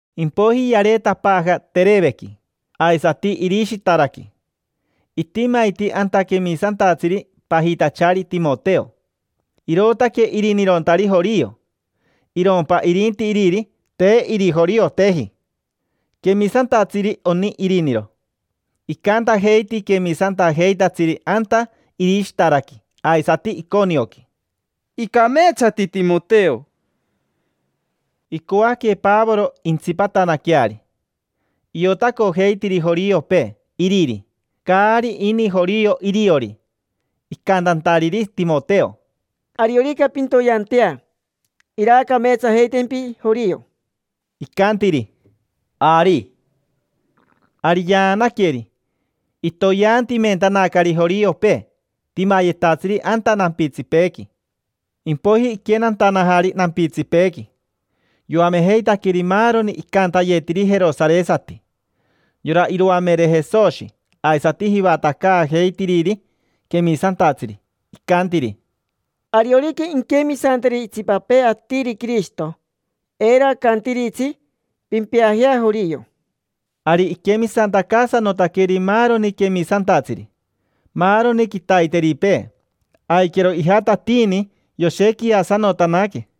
Impoiji yareetapaaja Terevequi, aisati Irishitaraqui. Itimaiti anta quemisantatsiri pajitachari Timoteo. Irootaque irinirontari jorio. Irompa irinti iriri, te irijorioteji. Quemisantatsiri oni iriniro. Icantajeiti quemisantajeitatsiri anta Irishitaraqui aisati Iconioqui: —Icameetsati Timoteo. Icoaque Pavoro intsipatanaqueari. Iotacojeitiri joriopee iriri, caari ini jorio iriori, icantantariri Timoteo: —Ariorica pintoyeantea, iraacameetsajeitempi jorio. Icantiri: —Ari. Ari yaanaqueri, itoyeantimentanacari joriopee, timayetatsiri anta nampitsipeequi. Impoiji iquenantanajari nampitsipeequi, yoamejeitaqueri maaroni icantayetiri jerosaresati: yora iroamere Jesoshi aisati jivatacaajeitiriri quemisantatsiri. Icantiri: —Ariorica inquemisanteri itsipapee atiri Quirishito, eiro acantiritsi: “Pimpeajea jorio”. Ari iquemisantacaasanotaqueri maaroni quemisantatsiri. Maaroni quitaiteripee aiquero ijatatiini yoshequiasanotanaque.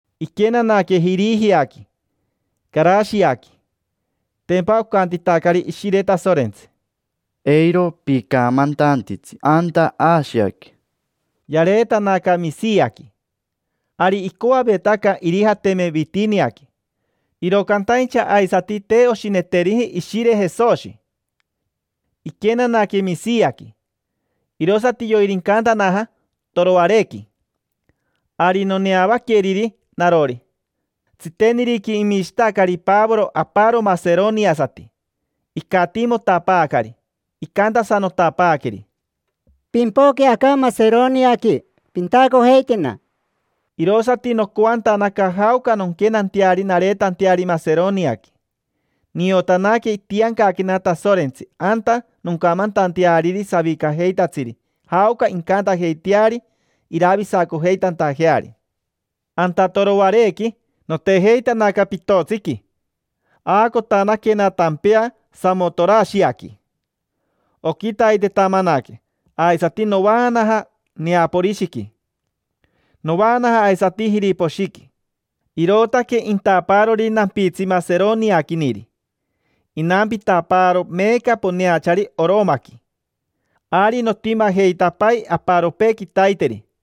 Iquenanaque Jirijiaqui, Carashiaqui. Tempa ocantitacari Ishire Tasorentsi: —Eiro picamantantitsi anta Ashiaqui. Yareetanaca Mishiaqui, ari icoavetaca irijateme Vitiniaqui. Iro cantaincha aisati te oshineteriji Ishire Jesoshi. Iquenanaque Mishiaqui, irosati yoirincantanaja Toroarequi: ari noneavaqueriri narori. Tsiteniriqui imishitacari Pavoro aparo maseroniasati. Icatiimotapaacari, icantasanotapaaqueri: —Pimpoque aca Maseroniaqui, pintacojeitena. Irosati nocoantanaca jaoca nonquenanteari nareetanteari Maseroniaqui. Niotanaque itiancaquena Tasorentsi anta noncamantanteariri savicajeitatsiri jaoca incantajeiteari iravisacojeitantajeari. Anta Toroarequi notejeitanaca pitotsiqui. Aacotanaquena tampea Samotorashiaqui. Oquitaitetamanaque aisati novaamanaja Neaporishiqui. Novaanaja aisati Jiriposhiqui. Irootaque intapaarori nampitsi Maseroniaquiniri. Inampitapaaro meeca poneachari Oromaqui. Ari notimajeitapai aparopee quitaiteri.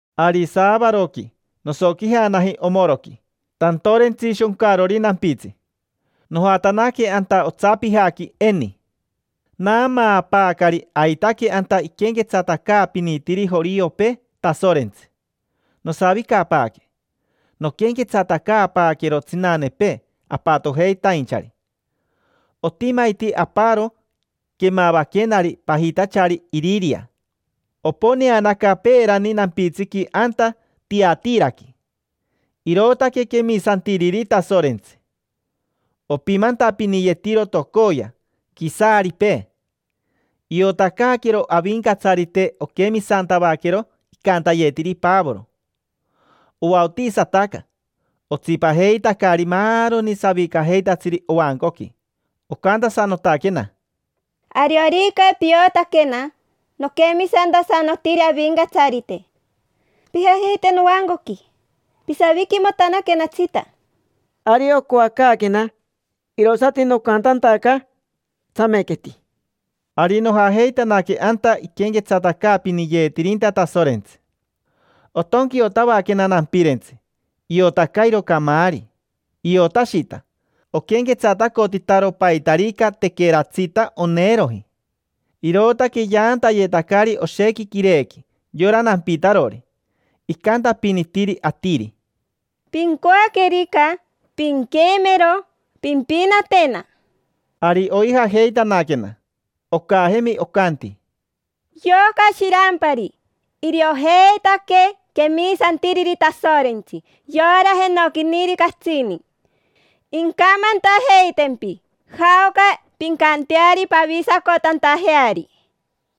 Ari saavaroqui nosoquijanaji omoroqui tantorentsi shoncarori nampitsi, nojatanaque anta otsapijaqui eni. Naamaapaacari aitaque anta iquenquetsatacaapinitiri joriopee Tasorentsi. Nosavicapaaque, noquenquetsatacaapaaquero tsinanepee apatojeitainchari. Otimaiti aparo quemavaquenari pajitachari Iriria. Oponeanaca peerani nampitsiqui anta Tiatiraqui. Irootaque quemisantiriri Tasorentsi. Opimantapiniyetiro tocoya quisaaripee. Iotacaaquero Avincatsarite oquemisantavaquero icantayetiri Pavoro. Ovaotisataca, otsipajeitacari maaroni savicajeitatsiri ovancoqui. Ocantasanotaquena: —Ariorica piotaquena noquemisantasanotiri Avincatsarite, pijajeite novancoqui, pisaviquimotanaquenatsita. Ari ocoacaaquena, irosati nocantantacari: —Tsamequeti. Ari nojajeitanaque anta iquenquetsatacaapiniyeetirinta Tasorentsi. Otonquiotavaquena nampirentsi, iotacairo camaari. Iotashita, oquenquetsatacotitaro paitarica tequeratsita oneeroji. Irootaque yaantayetacari oshequi quirequi yora nampitarori. Icantapinitiri atiri: —Pincoaquerica pinquemero, pimpinatena. Ari oijajeitanaquena. Ocajemi, ocanti: —Yoca shirampari, iriojeitaque quemisantiriri Tasorentsi, yora jenoquiniri catsini. Incamantajeitempi jaoca pincanteari pavisacotantajeari.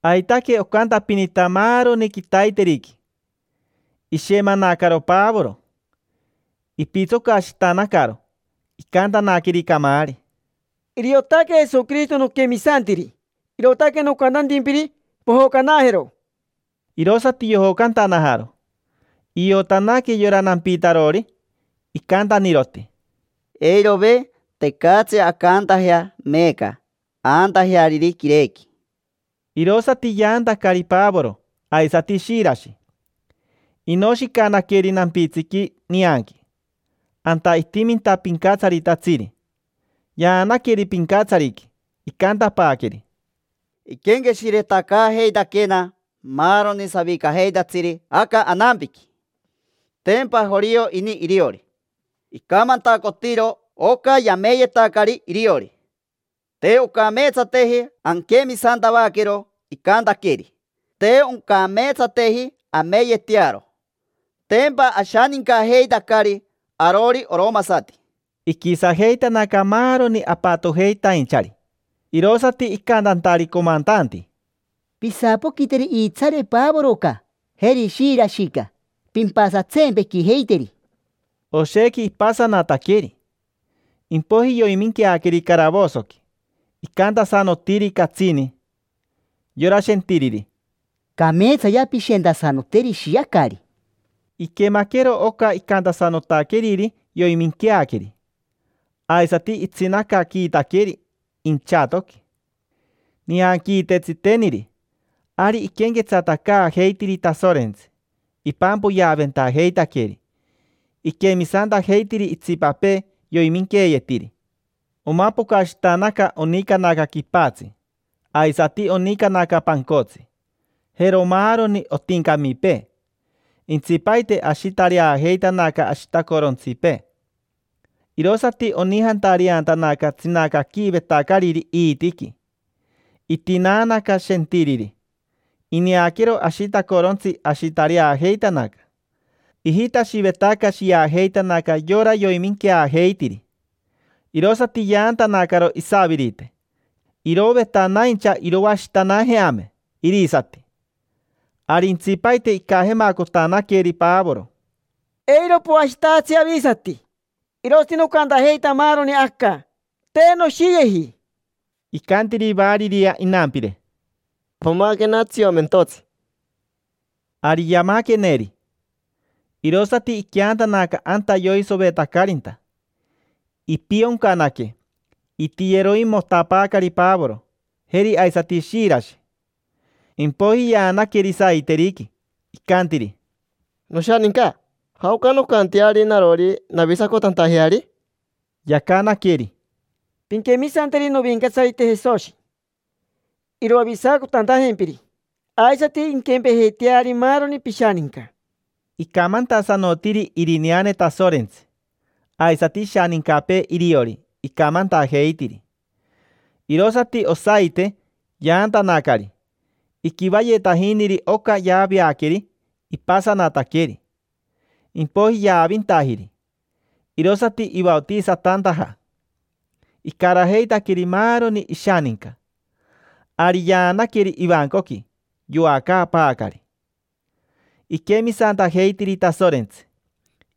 Aitaque ocantapinita maaroni quitaiteriqui. Ishemanacaro Pavoro, ipitsocashitanacaro, icantanaqueri camaari: —Iriotaque Jesoquirishito noquemisantiri, irootaque nocantantimpiri: pojocanajero. Irosati yojocantanajaro. Iotanaque yora nampitarori, icantaniroti: —Eirove, tecatsi ancantajea meeca aantajeariri quirequi. Irosati yaantacari Pavoro aisati Shirashi, tapi. Inoshicanaqueri nampitsiqui, nianqui: anta itiminta pincatsaritatsiri. Yaanaqueri pincatsariqui, icantapaaqueri: —Iquenqueshiretacaajeitaquena maaroni savicajeitatsiri aca anampiqui. Tempa jorio ini iriori. Icamantacotiro oca yameyetacari iriori. Te oncameetsateji anquemisantavaquero icantaqueeri, te oncameetsateji ameyetearo. Tempa ashanincajeitacari arori oromasati. Iquisajeitanaca maaroni apatojeitainchari, irosati icantantari comantanti: —Pisapoquiteri iitsaare Pavoroca, jeri Shirashica; pimpasatsempequijeiteri. Oshequi ipasanataqueri, impoiji yoiminqueaqueri caravosoqui. Icantasanotiri catsini yora shentiriri: —Cameetsayea pishentasanoteri, ishiacari. Iquemaquero oca icantasanotaqueriri, yoiminqueaqueri. Aisati itsinacaquiitaqueri inchatoqui. Nianquiite tsiteniri, ari iquenquetsatacaajeitiri Tasorentsi, ipampoyeaventajeitaqueri. Iquemisantajeitiri itsipapee yoiminqueeyetiri. Omapocashitanaca onicanaca quipatsi, aisati onicanaca pancotsi, jero maaroni otincamipee, nica, nica, nica. Intsipaite ashitareajeitanaca ashitacorontsipee. Irosati onijantareantanaca tsinacaquiivetacariri iitiqui. Itinaanaca shentiriri. Ineaquero ashitacorontsi, ashitareajeitanaca. Ijitashivetaca shiajeitanaca yora yoiminqueajeitiri, irosati yaantanacaro isavirite, irovetanaincha iroashitanajeame irisati. Ari intsipaite icajemacotanaqueri Pavoro: —Eiro poashitajatsi avisati. Irosati nocantajeita maaroni aca, te noshiyeji. Icantiri variria inampire: —Pamaquena tsiomentotsi. Ari yamaqueneri, irosati iqueantanaca anta yoisovetacarinta. Ipioncanaque, itiyeroimotapaacari Pavoro, jeri aisati Shirashi. Impoiji yaanaqueri saiteriqui. Icantiri: —Noshaninca, ¿jaoca noncanteari narori navisacotantajeari? Yacanaqueri: —Pinquemisanteri Novincatsarite Jesoshi, iroavisacotantajempiri. Aisati inquempejeiteari maaroni pishaninca. Icamantasanotiri irineane Tasorentsi. Aisati ishanincapee iriori, icamantajeitiri. Irosati osaite yaantanacari, iquivayetajiniri oca yaaveaqueri ipasanataqueri, impoiji yaavintajiri. Irosati ivaotisatantaja, icarajeitaqueri maaroni ishaninca. Ari yaanaqueri ivancoqui, yoacaapaacari. Iquemisantajeitiri Tasorentsi,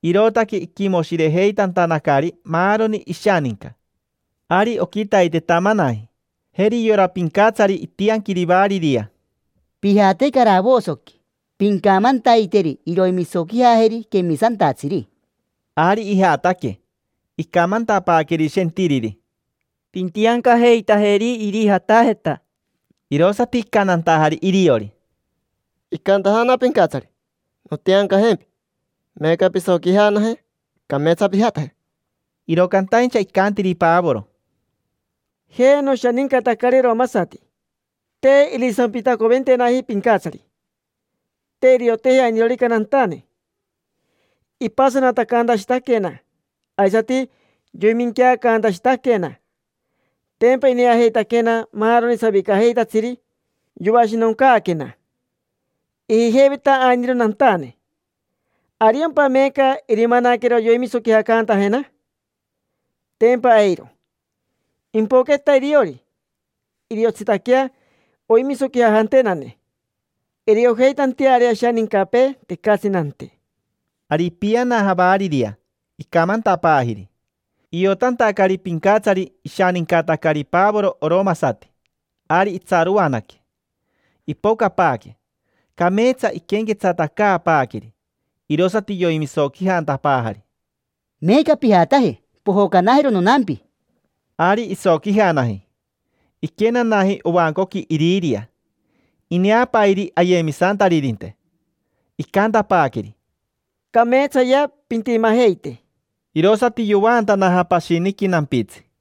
irootaque iquimoshirejeitantanacari maaroni ishaninca. Ari oquitaitetamanaji, jeri yora pincatsari itianquiri variria: —Pijate caravosoqui, pincamantaiteri iroimisoquijajeri quemisantatsiri. Ari ijataque, icamantapaaqueri shentiriri: —Pintiancajeitajeri irijatajeta. Irosati icantantajari iriori: —Icantajana pincatsari nontiancajempi. Meeca pisoquijanaje, cameetsa pijataje. Iro cantaincha icantiri Pavoro: —Jampa noshanincatacari oromasati. Te irisampitacoventenaji pincatsari, te irioteji ainirorica nantane. Ipasatacantashitaquena, aisati yoiminqueacantashitaquena. Tempa ineajeitaquena maaroni savicajeitatsiri yoashinoncaaquena: ijijeiveta ainiro nantane. ¿Ariompa meeca irimanaquero iroimisoquijacantajena? Tempa eiro. Impoqueta iriori, iriotsitaquea oimisoquijajantenane iriojeitanteari ashanincapee tecatsi nante. Ari ipianaja variria, icamantapaajiri. Iotantacari pincatsari ishanincatacari Pavoro oromasati, ari itsaroanaque. Ipocapaaque, cameetsa iquenquetsatacaapaaqueri. Irosati yoimisoquijantapaajari: —Meeca pijataje, pojocanajero nonampi. Ari isoquijanaji, iquenanaji ovancoqui Iriria. Ineapairi ayemisantaririnte, icantapaaqueri: —Cameetsayea pintimajeite. Irosati yovaantanaja pashiniqui nampitsi.